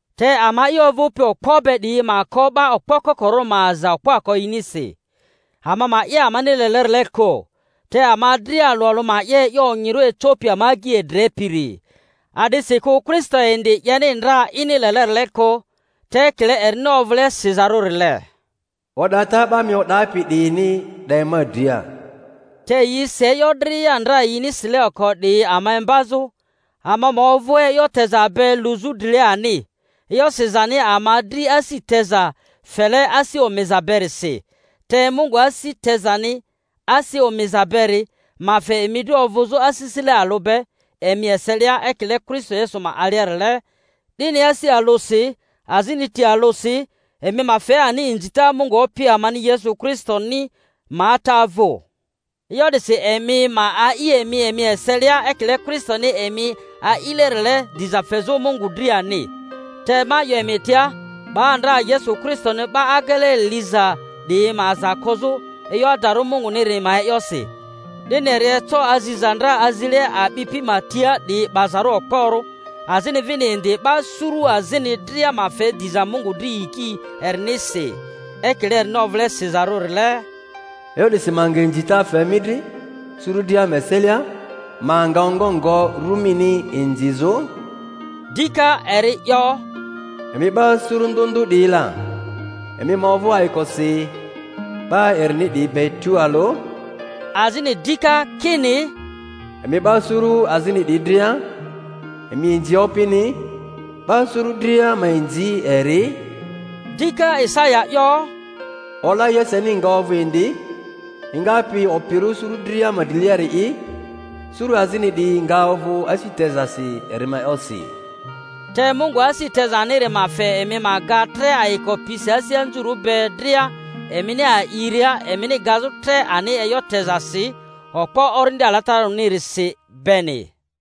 Te ama'i ovᴜpi okpo be 'diyi ma ko 'ba okpo kokorᴜ ma aza okpoako yinisi, ama ma 'ye amani lelerile kᴜ; te ama dria alᴜ alᴜ ma 'ye e'yo onyirᴜ ecopi ama agyi edrepiri. A'disikᴜ Kristo indi 'yeni ndra ini lelerile kᴜ; te ekile erini ovᴜle sizarᴜrile, O'data 'ba mi o'dapi 'diyini 'de ma dria. Te yi si e'yo dria ndra yini sile oko 'diyi ama imbazᴜ, ama ma ovᴜ e'yo teza be luzᴜ drile ani, e'yo sizani ama dri asi teza fele asi omiza berisi. Te Mungu asi tezani asi omiza beri ma fe emi dri ovᴜzᴜ asisile alᴜ be emi eselia, ekile Kristo Yesu ma aliarile, 'dini asi alᴜsi azini ti alᴜsi emi ma fe ani inzita Mungu Opi amani Yesu Kristoni ma Ata vᴜ. E'yo 'disi emi ma a'i emi emi eselia ekile Kristoni emi a'ilerile, diza fezᴜ Mungu dri ani. Te ma 'yo emi tia, 'ba ndra Yesu Kristoni 'ba agele liza 'diyi ma aza kozᴜ e'yo adarᴜ Munguniri ma e'yosi, 'dini eri eco aziza ndra azile a'bipi ma tia 'diyi 'bazarᴜ okporᴜ, azini vini indi 'ba suru azini dria ma fe diza Mungu dri yiki erinirisi. Ekile erini ovᴜle sizarᴜrile, E'yo 'disi ma nga inzita fe mi dri suru dria ma eselia, ma nga ongo ngo ru mini inzizᴜ; dika eri 'yo, Emi 'ba suru ndᴜ ndᴜ 'diyi la, emi ma ovᴜ ayikosi 'ba erini 'diyi be tualᴜ; azini dika kini, Emi 'ba suru azini 'diyi dria, emi inzi Opini, 'ba suru dria ma inzi eri; dika Isaya 'yo, Ola Yeseni nga ovᴜ indi, engapi opirᴜ suru dria ma driliari'i; suru azini 'diyi nga ovᴜ asi tezasi eri ma e'yosi. Te Mungu asi tezaniri ma fe emi ma ga tre ayiko pisi asi anzurᴜ be dria emini a'iria, emini gazᴜ tre ani e'yo tezasi okpo Orindi Alatararᴜni-risi beni.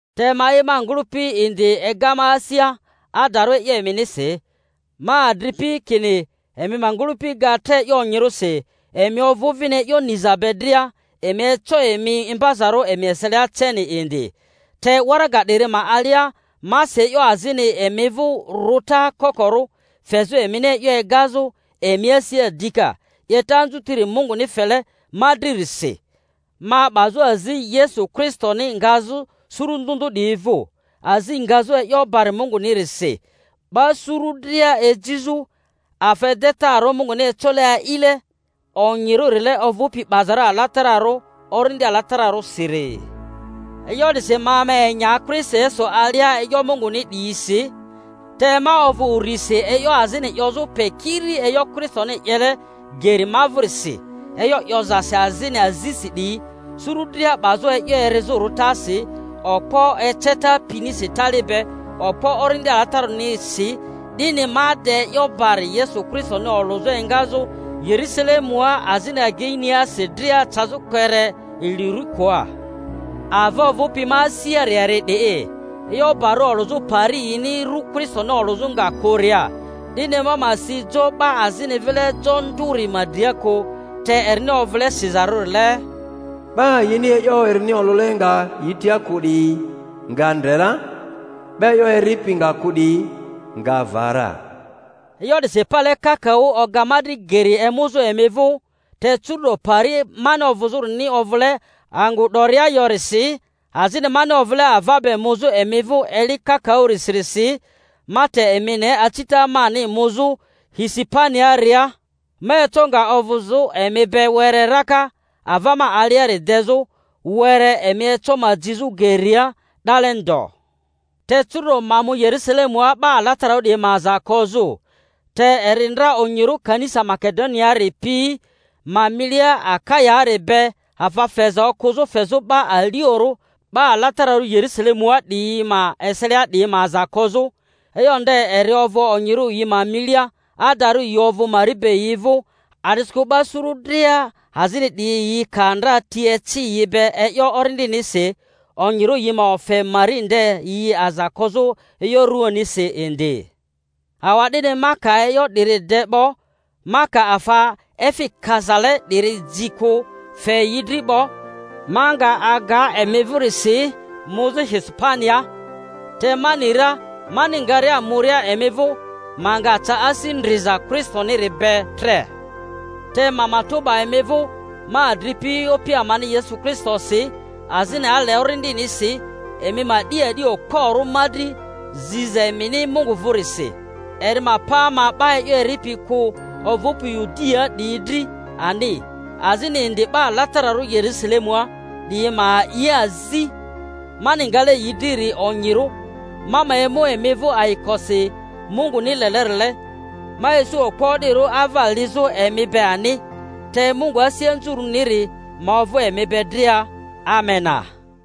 Te ma'i, ma ngᴜlᴜpi indi ega ma asia adarᴜ e'yo eminisi, ma adri-pi, kini emi ma ngᴜlᴜpi ga tre e'yo onyirᴜsi, emi ovᴜ vini e'yo niza be dria, emi eco emi imbazarᴜ emi eselia ceni indi. Te waraga 'diri ma alia ma si e'yo azini emi vᴜ rᴜta kokoro, fezᴜ emini e'yo egazᴜ emi asia dika, 'yeta anzutiri Munguni fele ma dririsi ma 'bazᴜ azi Yesu Kristoni ngazᴜ suru ndᴜ ndᴜ 'diyi vᴜ, azi ngazᴜ e'yo barᴜ Mungunirisi, 'ba suru dria ejizᴜ afa edetarᴜ Munguni ecole a'ile onyirᴜrile, ovᴜpi 'bazarᴜ alatararᴜ Orindi Alatararᴜsiri. E'yo 'disi ma ma enya Kristo Yesu alia e'yo Munguni 'diyisi. Te ma ovᴜ urisi e'yo azini 'yozᴜ pe kiri e'yo Kristoni 'yele geri ma vᴜrisi, e'yo 'yozasi azini azisi 'diyi, suru dria 'bazᴜ e'yo erizᴜ rᴜtasi, okpo eceta pinisi tali be, okpo Orindi Alatararᴜnisi, 'dini ma de e'yo bari Yesu Kristoni olᴜzᴜ engazᴜ Yerᴜsalemua azini ageiniasi dria cazᴜ kpere Ilurikoa. Ava ovᴜpi ma asiari eri 'di'i, e'yo bari olᴜzᴜ pari yini ru Kristoni olᴜzᴜ nga kᴜria, 'dini ma ma si jo 'ba azini vile jo nduri ma dria kᴜ, te erini ovᴜle sizarᴜrile, 'Ba yini e'yo erini olᴜle nga yi tia kᴜ 'diyi nga ndre ra, 'ba e'yo eripi nga kᴜ 'diyi nga va ra. E'yo 'disi pale kakaᴜ oga ma dri geri emuzᴜ emi vᴜ. Te curu'do pari mani ovᴜzᴜrini ovᴜle angᴜ 'doria yorisi, azini mani ovᴜle ava be muzᴜ emi vᴜ eli kakaᴜsirisi, ma te emi ne acita mani muzᴜ Hispaniaaria, ma eco nga ovᴜzᴜ emi be were raka, ava ma aliari dezᴜ were, emi eco ma jizᴜ geria 'dale ndo. Te curu'do ma mu Yerusalemua 'ba alatararᴜ 'diyi ma aza kozᴜ. Te eri ndra onyirᴜ kanisa Make-doniaari pi ma milia Akayaari be afa feza okᴜzᴜ fezᴜ 'ba aliorᴜ 'ba alatararᴜ Yerusalemua 'diyi ma eselia 'diyi ma aza kozᴜ; e'yo nde eri ovᴜ onyirᴜ yi ma milia, adarᴜ yi ovᴜ mari be yi vᴜ, a'disikᴜ 'ba suru dria azini 'diyi yi ka ndra ti eci yi be e'yo Orindinirisi, onyirᴜ yi ma ofe mari nde yi aza kozᴜ e'yo ruanisi indi. Awa'dini ma ka e'yo 'diri de 'bo, ma ka afa efi kazale 'diri ji kᴜ fe yi dri 'bo, ma nga aga emi vᴜrisi muzᴜ Hispaniaa; te ma ni ra mani ngaria muria emi vᴜ ma nga ca asi ndriza Kristoniri be.tre. Te ma matᴜ 'ba emi vᴜ, ma adripi, Opi amani Yesu Kristonisi azini ale Orindinisi, emi ma 'di a'di okporᴜ ma dri ziza emini Mungu vᴜrisi, eri ma pa ma 'ba e'yo eripi kᴜ ovᴜpi Yudiaa 'diyi dri ani, azini indi 'ba alatararᴜ Yerusalemua 'diyi ma a'i azi mani ngale yi driri onyirᴜ, ma ma emu emi vᴜ ayikosi Munguni lelerile, ma isu okpo o'dirᴜ ava lizᴜ emi be ani. Te Mungu asi anzurᴜniri ma ovᴜ emi be dria. Amena.